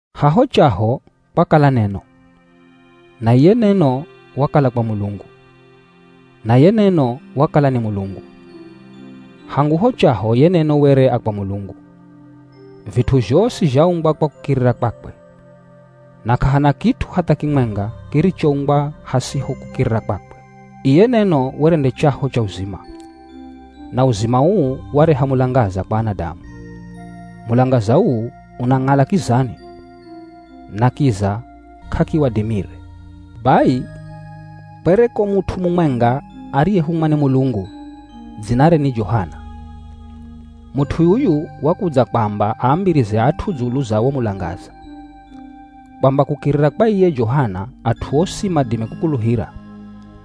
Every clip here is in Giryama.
Haho chaho kwakala neno, na iye Neno wakala kwa Mulungu, na ye Neno wakala ni Mulungu. Hangu ho chaho ye Neno were a kwa Mulungu. Vit'u zhosi zhaumbwa kwa kukirira kwakwe. Na k'ahana kit'u hatha kimwenga kirichoumbwa hasiho kukirira kwakwe. Iye Neno were nde chaho cha uzima, na uzima uu wareha mulangaza kwa anadamu. Mulangaza uu, unang'ala kizani na kiza k'akiwadimire. Bai kwereko mut'u mumwenga ariyehumwa ni Mulungu, dzinare ni Johana. Mut'u yuyu wakudza kwamba aambirize at'u dzulu za wo mulangaza, kwamba kukirira kwa iye Johana at'u osi madime kukuluhira.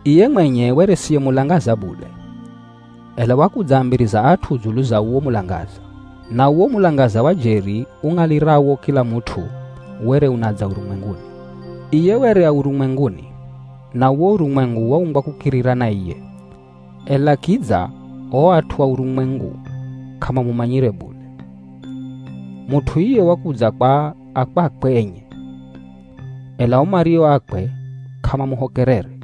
Iye mwenye were siye mulangaza bule, ela wakudzaambiriza at'u dzulu za uwo mulangaza. Na uwo mulangaza wa jeri ung'alirawo kila mut'u, were unadza urumwenguni. Iye were a urumwenguni, na uwo urumwengu waumbwa kukirira na iye, ela kidza o at'u a urumwengu k'amamumanyire bule. Mut'u iye wakudza kwa a kwakwe enye, ela o mario akwe k'amamuhokerere.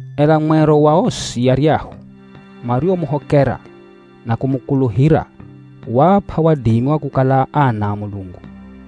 Ela mwero wa osi aryahu mariomuhokera na kumukuluhira waap'a wadimi wa kukala ana a Mulungu.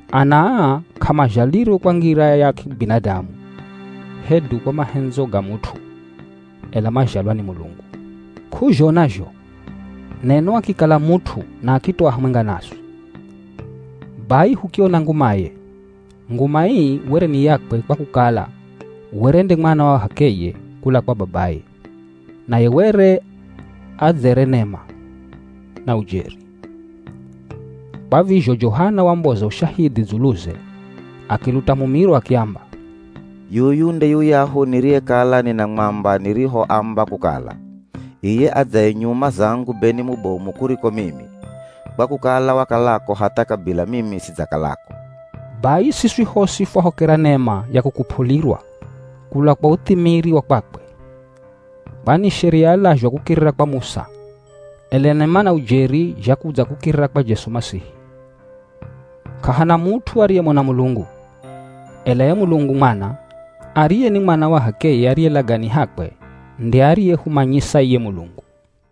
Ana aa k'amazhalirwe kwa ngira ya kibinadamu, hedu kwa mahendzo ga mut'u, ela mazhalwa ni Mulungu. K'uzhona zho, Neno akikala mut'u na akitoa hamwenga naswi. Bai hukiona ngumaye. Nguma ii were ni yakwe kwa kukala were nde Mwana wa h'akeye kula kwa babaye, naye were adzere nema na ujeri. Kwa vizho Johana wamboza ushahidhi dzuluze, akiluta mumiro akiamba, “Yuyu nde yuyahu niriyekala ninamwamba nirihoamba kukala, ‘Iye adzaye nyuma zangu be ni mubomu kuriko mimi, kwa kukala wakalako hatha kabila mimi sidzakalako.’” Bai siswi hosi fwahokera nema ya kukup'ulirwa kula kwa uthimiri wa kwakwe. Kwani Sheria yalazhwa kukirira kwa Musa, ela nema na ujeri zhakudza kukirira kwa Jesu Masihi. K'ahana mut'u ariyemona Mulungu, ela ye Mulungu Mwana, ariye ni Mwana wa h'akeye ariye lagani hakwe nde ariyehumanyisa iye Mulungu.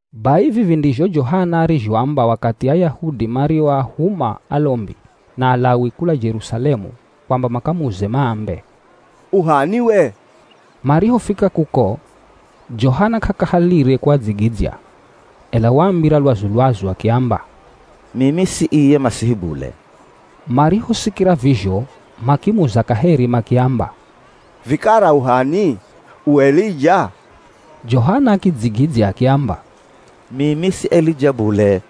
Bai vivi ndizho Johana arizhoamba wakathi Ayahudi marihoahuma alombi na Alawi kula Jerusalemu kwamba makamuze maambe, “U h'ani we?” Marihofika kuko, Johana k'akahalire kuadzigidzya, ela waambira lwazu-lwazu akiamba, “Mimi si iye Masihi bule.” Marihosikira vizho makimuza kaheri makiamba, “Vikara u h'ani? U Elija?” Johana akidzigidzya akiamba, “Mimi si Elija bule.”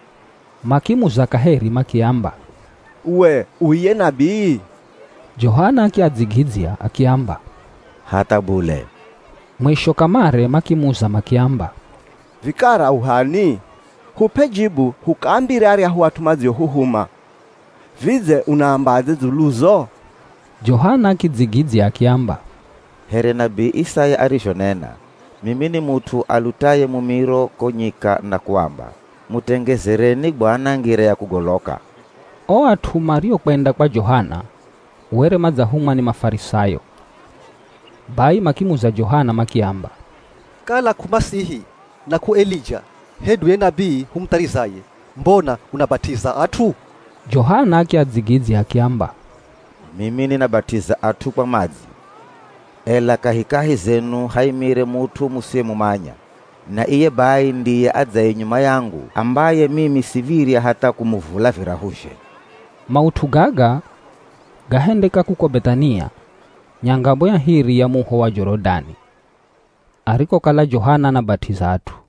Makimuza kaheri makiamba, “We u iye nabii?” Johana akiadzigidzya akiamba, “Hatha bule.” Mwisho kamare makimuza makiamba, “Vikara u h'ani? Hup'e jibu hukaambire aryahu at'u madziohuhuma. Vidze unaambadze dzuluzo?” Johana akidzigidzya akiamba, “Here nabii Isaya arizhonena, Mimi ni mut'u alutaye mumiro ko nyika na kuamba, ‘Mutengezereni Bwana ngira ya kugoloka.’” O at'u mariokwenda kwa Johana, were madzahumwa ni Mafarisayo. Bai makimuza Johana makiamba, “Kala k'u Masihi na k'u Elija, hedu ye nabii humutharizaye, mbona unabat'iza at'u?” Johana akiadzigidzya akiamba, “Mimi ninabat'iza at'u kwa madzi, ela kahikahi zenu haimire mut'u musiyemumanya. Na iye bai ndiye adzaye nyuma yangu ambaye mimi siv̱irya hatha kumuvula virahuzhe.” Maut'u gaga gahendeka kuko Beth'ania, nyangamo ya hiri ya muho wa Jorodani arikokala Johana anabat'iza at'u.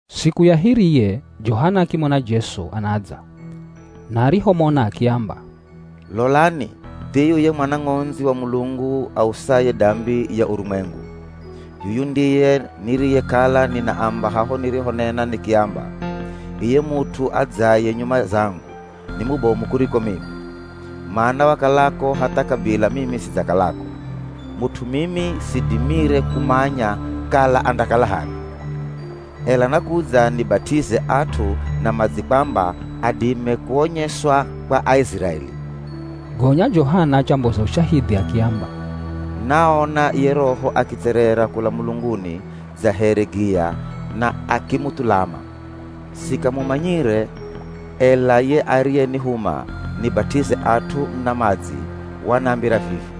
Siku ya hiriye Johana akimona Jesu anadza na arihomona akiamba, “Lolani thiyu ye Mwana Ng'ondzi wa Mulungu ausaye dambi ya urumwengu. Yuyu ndiye niriyekala ninaamba haho nirihonena nikiamba, ‘Iye mut'u adzaye nyuma zangu, ni mubomu kuriko mimi, mana wakalako hatha kabila mimi sidzakalako.’ Mut'u mimi sidimire kumanya kala andakala h'ani, ela nakudza nibat'ize at'u na madzi kwamba adime kuonyeswa kwa Aiziraeli.” Gonya Johana achamboza ushahidhi akiamba, “Naona ye Roho akitserera kula mulunguni dza here giya na akimuthulama. Sikamumanyire, ela ye ariyenihuma nibat'ize at'u na madzi wanambira vivi,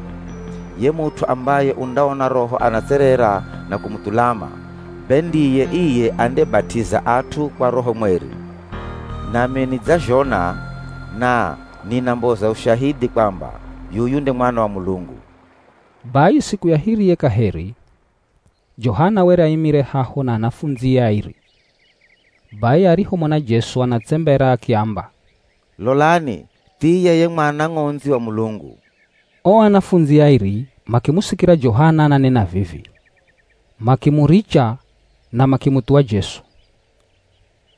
‘Ye mut'u ambaye undaona Roho anatserera na kumuthulama, be ndiye iye andebat'iza at'u kwa Roho Mweri.’ Nami nidzazhona na ninamboza ushahidhi kwamba yuyu nde Mwana wa Mulungu.” Bai siku ya hiriye kaheri, Johana were aimire haho na anafundzie airi, bai arihomona Jesu anatsembera akiamba, “Lolani thiye ye Mwana Ng'ondzi wa Mulungu.” O anafundzi airi makimusikira Johana ananena vivi, makimuricha na makimuthuwa Jesu.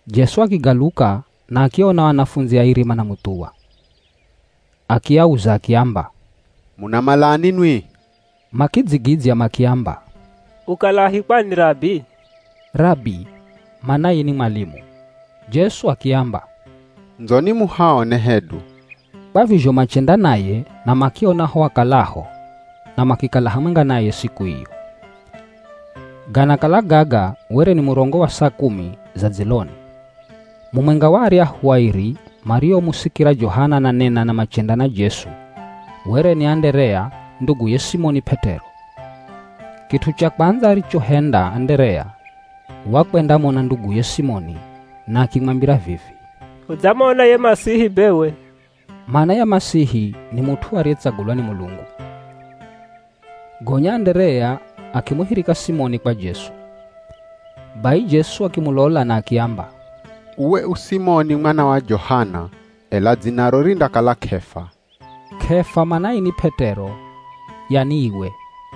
Jesu akigaluka na akiaona o anafundzi airi manamuthuwa, akiauza akiamba, “Munamalani nwi?” Makidzigidzya makiamba, “Ukalahi kwani Rabi?” (Rabi manaye ni mwalimu.) Jesu akiamba, “Ndzoni muhaone hedu.” Kwa vizho machenda naye na makiona ho akalaho na makikala hamwenga naye siku iyo. Ganakala gaga were ni murongo wa saa kumi za dziloni. Mumwenga wa aryahu airi mariomusikira Johana ananena na machenda na Jesu, were ni Anderea, nduguye Simoni P'et'ero. Kit'u cha kwandza arichohenda Anderea wakwendamona nduguye Simoni na akimwambira vivi, “Hudzamona ye Masihi bewe.” (Mana ya Masihi ni mut'u ariyetsagulwa ni Mulungu.) Gonya Anderea akimuhirika Simoni kwa Jesu. Bai Jesu akimulola na akiamba, “Uwe u Simoni mwana wa Johana, ela dzinaro rindakala K'efa.” (K'efa manaye ni P'et'ero yani iwe.)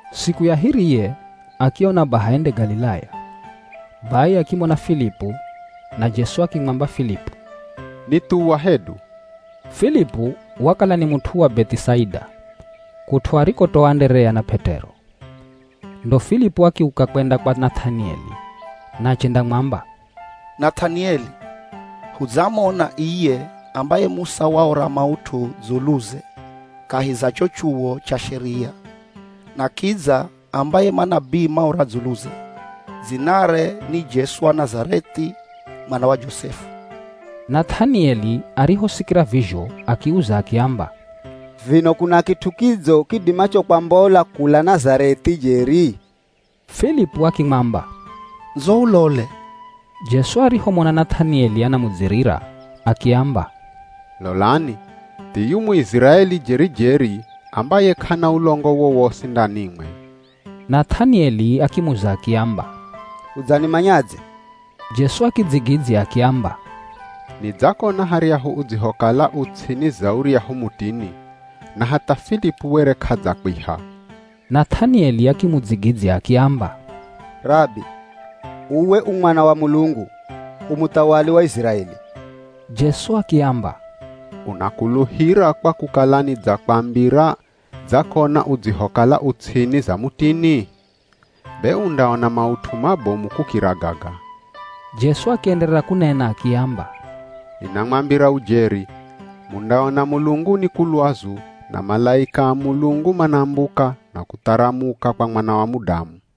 Siku ya hiriye akiona baha ende Galilaya. Bai akimona Filipu, na Jesu akimwamba Filipu, “Nithuwa hedu.” Filipu wakala ni mut'u wa Beth'isaida, kut'u arikotoa Anderea na P'et'ero. Ndo Filipu akiuka kwenda kwa Nath'anieli na achendamwamba, “Nath'anieli hudzamona iye ambaye Musa waora maut'u dzuluze kahi za cho chuwo cha Sheria, na kidza ambaye manabii maora dzuluze. Dzinare ni Jesu wa Nazareth'i, mwana wa Josefu.” Nath'anieli arihosikira vizho akiuza akiamba, “Vino kuna kit'u kidzo kidimacho kwambola kula Nazareth'i jeri?” Filipu akimwamba, “Ndzo ulole.” Jesu arihomona Nath'anieli anamudzirira akiamba, “Lolani, thiyu Muiziraeli jeri-jeri ambaye k'ana ulongo wowosi ndanimwe.” Nath'anieli akimuza akiamba, “Udzanimanyadze?” Jesu akidzigidzya akiamba, “Nidzakona haryahu udzihokala u ts'ini za uryahu mutini. Na hatha Filipu were k'adzakwiha.” Nath'anieli akimudzigidzya akiamba, “Rabi, uwe u Mwana wa Mulungu, u muthawali wa Iziraeli.” Jesu akiamba, “Unakuluhira kwa kukala nidzakwambira dzakona udzihokala u ts'ini za mutini? Be undaona maut'u mabomu kukira gaga.” Jesu akienderera kunena akiamba, “Ninamwambira ujeri, mundaona mulunguni ku lwazu na malaika a Mulungu manambuka na kutharamuka kwa Mwana wa Mudamu.”